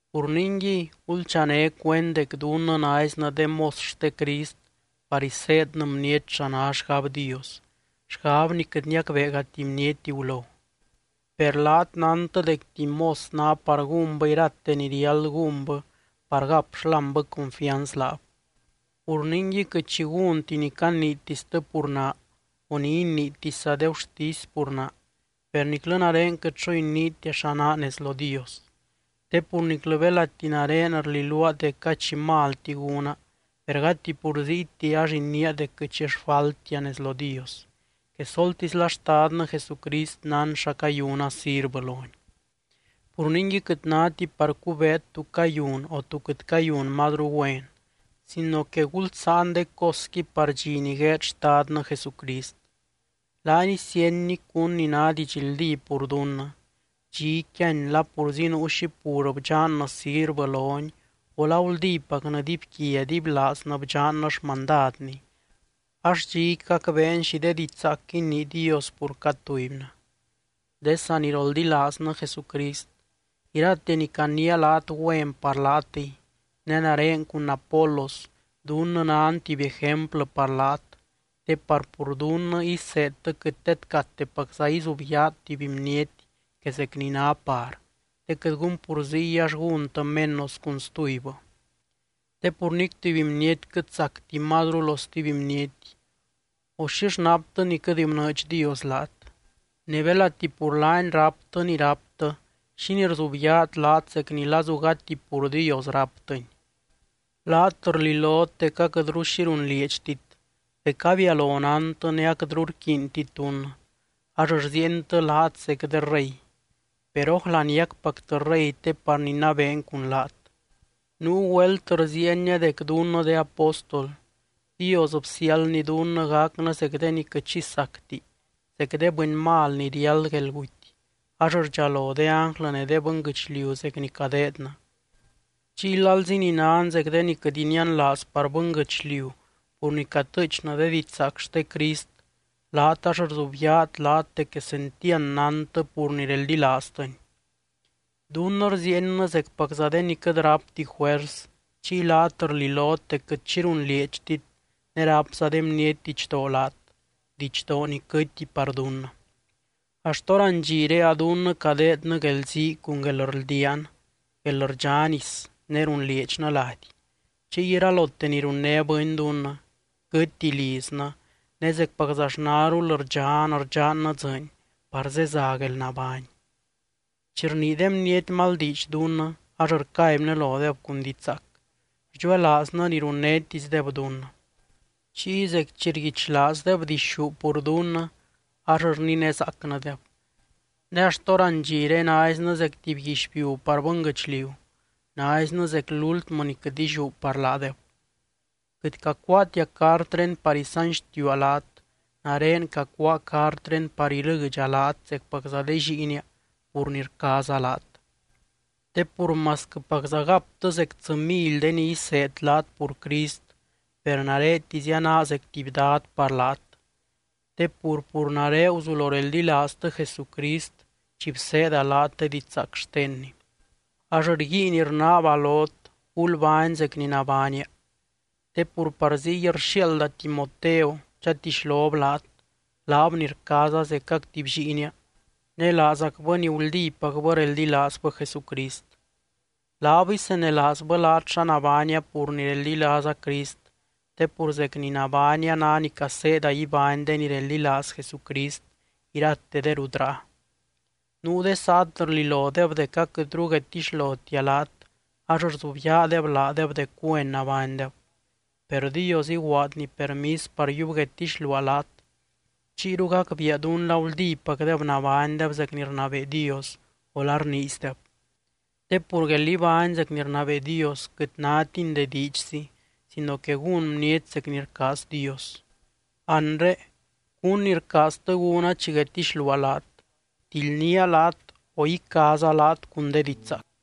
Pur ningui, gulchané cuend dec dunnɨ naiznɨ de mos xte Crist par iseednɨ bniety xa ná xgab Dios, xgab ni quɨt niacbeegati bniety gulo. Per laat nántɨ dec tuby mos ná par gúnbɨ irate ni riáld gúnbɨ par gap xlámbɨ confianz laab. Pur ningui, quɨt xi gúnti ni caniitistɨ pur naa o ni iniitisza de gurtisy pur naa, per niclɨ nare quɨt xo iniitia xa naa nez lo Dios. Te pur niclɨ belati nare rliluaa dec gady xi malti gúna per gati pur ziyti ax iniia dec quɨt xi xfaltia nez lo Dios, quesoltisla Xtadnɨ Jesucrist nán xa cayuna sirvɨ lony. Pur ningui quɨt náti par cubeet tú cayun o tú quɨt cayun mazru güen, sino que gulsáan de cosqui par dxi ni gueed Xtadnɨ Jesucrist. Laany isíenny cún ni ná didxldí pur dunnɨ, dxiqui yíany la purzi nuu xi pur bdxannɨ sirvɨ lony o la guldípacnɨ dibyquia dibylaaznɨ bdxannɨ xmandadny, ax dxiqui gacbeen xi de diidx zaac inii Dios pur cad tubynɨ. De saniroldilaaznɨ Jesucrist, irate ni caniia laat güen par laatɨy. Ne nare cun Apolos dunnɨ nan tuby ejemplɨ par laat, te par pur dunnɨ iseedtɨ quɨt tedcatepacza izubyaat tuby bniety que zec ni ná par, te quɨt gun pur ziy ax gúntɨ menos cun stubybɨ. Te pur nic tuby bniety quɨt sacti mazru lo stuby bniety o, ¿xix naptɨ ni quɨt bnɨɨdx Dios laat? Ne belati pur laany ráptɨ ni ráptɨ, ¿xínii rzubyaat laat zec ni lazu gati pur Dios ráptɨni? Laat rlilot dec aquɨtru xi runlieedxtit, dec abialo nántɨ ne aquɨtru rquiintit dunnɨ. Ax rziientɨ laat zec de rey per, ¿ójla niacpactɨ rey te par ninabeen cun laat? Nuu güelt rziienia dec dunnɨ de apóstol, Dios bsiáldny dunnɨ gacnɨ zec de ni quɨt xi sacti, zec de bɨny mal ni riáld guelguty, ax rdxalo de ánglɨ ne de bɨnguɨchliu zec ni cadeednɨ. Chiy lalzi ni nan zec de ni quɨt inianlaaz par bɨnguɨchliu pur ni catɨɨchnɨ de didxzaac xte Crist, laat ax rzubyaat laat dec quesentiand nántɨ pur ni reldilaaztɨny. Dunnɨ rziiennɨ zecpacza de ni quɨt rápti juers, chiy laat rlilot dec quɨt xi runlieedxtit ne rápza de bniety didxdoo laat, didxdoo ni quɨtti par dunnɨ. Axt hórandxire a dunnɨ cadeednɨ guelzii cun guelrldiaan, guelrdxá nis ne runlieedxnɨ lady. Chiy iralote ni runné bɨny dunnɨ, quɨtti liznɨ ne zecpaczaxnarul rdxan rdxannɨ dzɨɨny par zeza guelnabány. Chi rnii de bniety mal diidx dunnɨ ax rcaibnɨ lodeb cun diidx zaac, rdxuelaaznɨ ni runnétisdeb dunnɨ. Chiy zec chi rguichlaazdeb dixú pur dunnɨ, ax rninezaacnɨdeb. Ne axt hórandxire naiznɨ zec tuby guixbiu par bɨnguɨchliu, naiznɨ zec lúltmɨ ni quɨt illiú par laadeb. Quɨt cacuaatia cartré par isanxtiua laat, nare cacuáa cartré par ilɨdxa laat zecpacza de lliinia pur ni rcaaza laat. Te pur masquɨpacza gaptɨ zec tsɨ mily de ni iseed laat pur Crist, per naretizia naa zec tuby dad par laat. Te pur, pur nare guzulo reldilaaztɨ Jesucrist chi bseeda laat de didxzaac xtenny. Ax rguiin rnaaba lot, gulbány zec ni nabánia. Te pur par ziy rxiaalda Timoteo chatixlob laat, laab ni rcaaza zecac tuby lliinia ne laazacbɨ ni guldípacbɨ reldilaazbɨ Jesucrist. Laab isenelaazbɨ laat xa nabánia pur ni reldilaaza Crist, te pur zec ni nabánia ná ni caseeda ibány de ni reldilaaz Jesucrist irate de rut ráa. Nuu de saat rlilodeb dec aquɨtru guedtixlotia laat ax rzubyaadeb laadeb dec güen nabánydeb. Per Dios iguaadny permis par yiub guedtixluaa laat, chiyru gacbiia dún la guldípacdeb nabánydeb zec ni rnabee Dios o la rniizdeb. Te pur guél ibány zec ni rnabee Dios quɨt nátini de diidxzi sino que gún bniety zec ni rcaaz Dios. Anre, ¿cún ni rcaaztɨ gúna chi guedtixluaa laat, tildnía laat o icaaza laat cun de diidx zaac?